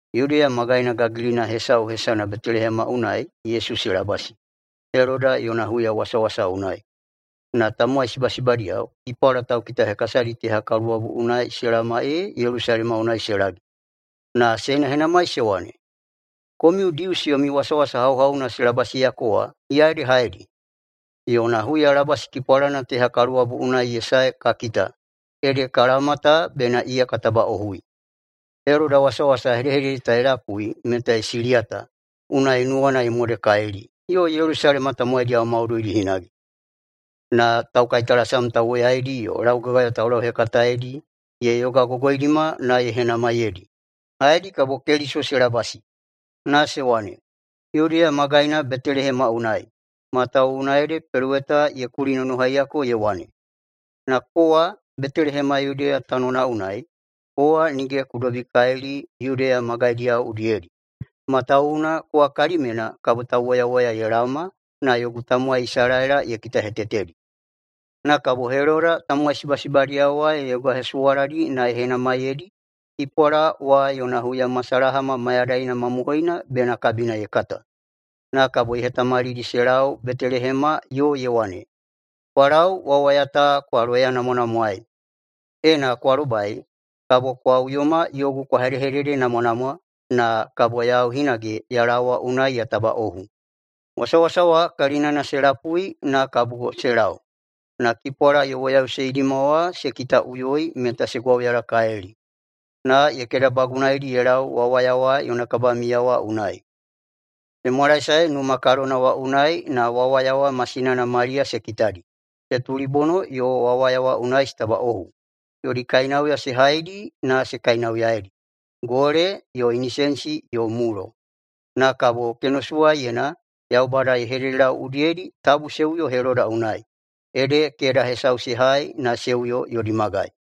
Yudeya magaina gagilina hesau hesana Betelehema unai Yesu se labasi, Heloda yona huyawasawasa unai. Na tamowai sibasibadiyao kipwala taukitahekasadi teha kaluwabu unai se laoma ee Yelusalema unai se lage, na se henahenamai se wane, “Komiu Dius yomi wasawasa hauhauna se labasiyako wa, iya ede haedi? Yona huyalabasi kipwalana teha kaluwabu unai ye sae ka kita, ede ka laoma ta bena iya ka tabaꞌohui.” Heloda wasawasa hedehedede ta ye lapui meta ye siliyata, unai nuwana ye modekalili, yo Yelusalema tamowaidi maudoidi hinage. Na taukaitalasam tauwoyaidi yo laugagayo taulauhekataedi ye yogagogoidima na ye henamaiyeidi, “Haedi kabo Keliso se labasi?” Na se wane, “Yudeya magaina Betelehema unai, matawuwuna ede peloweta ye kulinonohaiyako ye wane, ‘Na kowa, Betelehema Yudeya tanona unai, kowa nige ku dobikalili Yudeya magaidiyao udiyedi, matawuwuna kowa kalimyena kabo tauwoyawoya ye laoma na yogu tamowai Isalaela ye kitahetetedi.’” Na kabo Heloda tamowai sibasibadiyao wa ye yogahesuwaladi na ye henamaiyeidi kipwala wa yona huyamasalaha mayadaina mamohoina bena kabina ye kata. Na kabo ye hetamalidi se lau Betelehema yo ye wane, “Kwa lau wawaya ta kwa loyanamwanamwaei. Ena kwa lobai kabo kwa uyoma yogu kwa hedehededenamwanamwa, na kabo yau hinage ya laowa unai ya tabaꞌohu.” Wasawasa wa kalinana se lapui na kabo se lau, na kipwala ye woyaꞌuseidima wa se kitaꞌuyoi meta se gwauyalakalili. Na ye kedabagunaidi ye lau wawaya wa yona kabamiya wa unai. Se mwalaesae numa kalona wa unai na wawaya wa ma sinana Maliya se kitadi, se tulibono yo wawaya wa unai se tabaꞌohu. Yodi kainauya se haidi na se kainauyaidi, gole yo inisenisi yo mulo. Na kabo kenosuwaiyena Yaubada ye hededelau udiyedi tabu se uyo Heloda unai. Ede keda hesau se hai na se uyo yodi magai.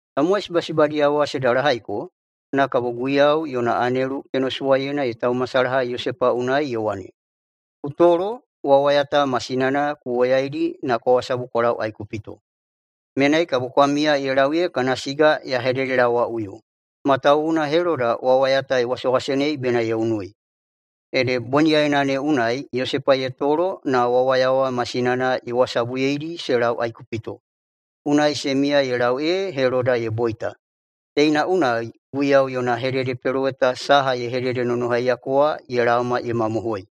Tamowai sibasibadiyao wa se dalahaiko, na kabo Guiyau yona anelu kenosuwaiyena ye taumasalaha Yosepa unai ye wane, “Ku tolo wawaya ta ma sinana ku woyaidi kwa wasabu kwa lau Aikupito. Menai kabo kwa miya ye lau ee kana siga ya hededelaowaꞌuyo. Matawuwuna Heloda wawaya ta ye wasewasenei bena ye unui.” Ede boniyaina ne unai Yosepa ye tolo na wawaya wa ma sinana ye wasabuyeidi se lau Aikupito. Unai se miya ye lau ee Heloda ye boita. Teina unai Guiyau yona hededepeloweta saha ye hededenonohaiyako wa ye laoma ye mamohoi: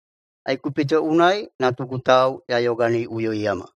“Aikupito unai natugu tau ya yoganeiꞌuyoiyama.”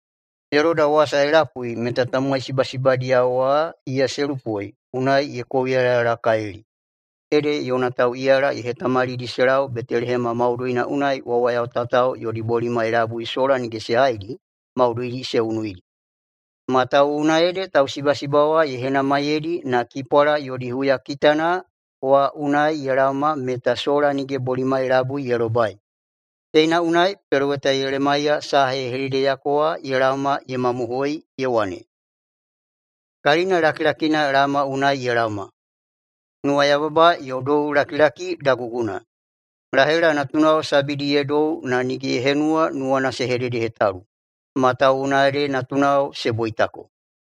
Heloda wasa ye lapui meta tamowai sibasibadiyao wa iya se lupoi, unai ye kouyalayalakalili. Ede yona tauꞌiyala ye hetamalidi se lau Betelehema maudoina unai wawayao tatao yodi bolimai labui sola nige se haidi maudoidi se unuidi. Matawuwuna ede tausibasiba wa ye henamaiyeidi na kipwala yodi huyakitana wa unai ye laoma meta sola nige bolimai labui ye lobai. Teina unai peloweta Yelemaiya saha ye hededeyako wa ye laoma ye mamohoi, ye wane, “Kalina lakilakina Lama unai ye laoma, nuwayababa yo doulakilaki daguguna. Lahela natunao sabidi ye dou na nige ye henuwa nuwana se hededehetalu, matawuwuna ede natunao se boitako.”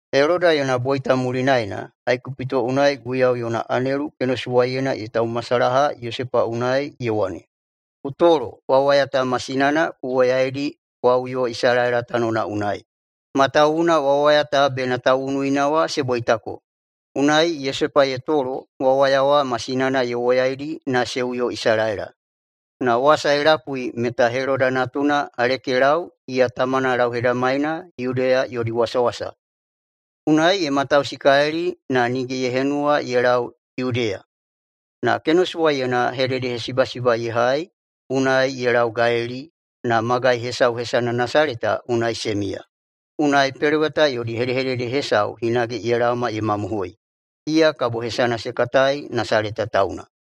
Heloda yona boita mulinaena, Aikupito unai Guiyau yona anelu kenosuwaiyena ye taumasalaha Yosepa unai ye wane, “Ku tolo wawaya ta ma sinana ku woyaidi kwa uyo Isalaela tanona unai, matawuwuna wawaya ta bena tauꞌunuina wa se boitako.” Unai Yosepa ye tolo wawaya wa ma sinana ye woyaidi na se uyo Isalaela. Na wasa ye lapui meta Heloda natuna Alekelau iya tamana lauhedamaina Yudeya yodi wasawasa, unai ye matausikalili na nige ye henuwa ye lau Yudeya. Na kenosuwaiyena hededehesibasiba ye haidi, unai ye lau Galili na magai hesau hesana Nasaleta unai se miya. Unai peloweta yodi hedehedede hesau hinage ye laoma ye mamohoi: “Iya kabo hesana se katai Nasaleta tauna.”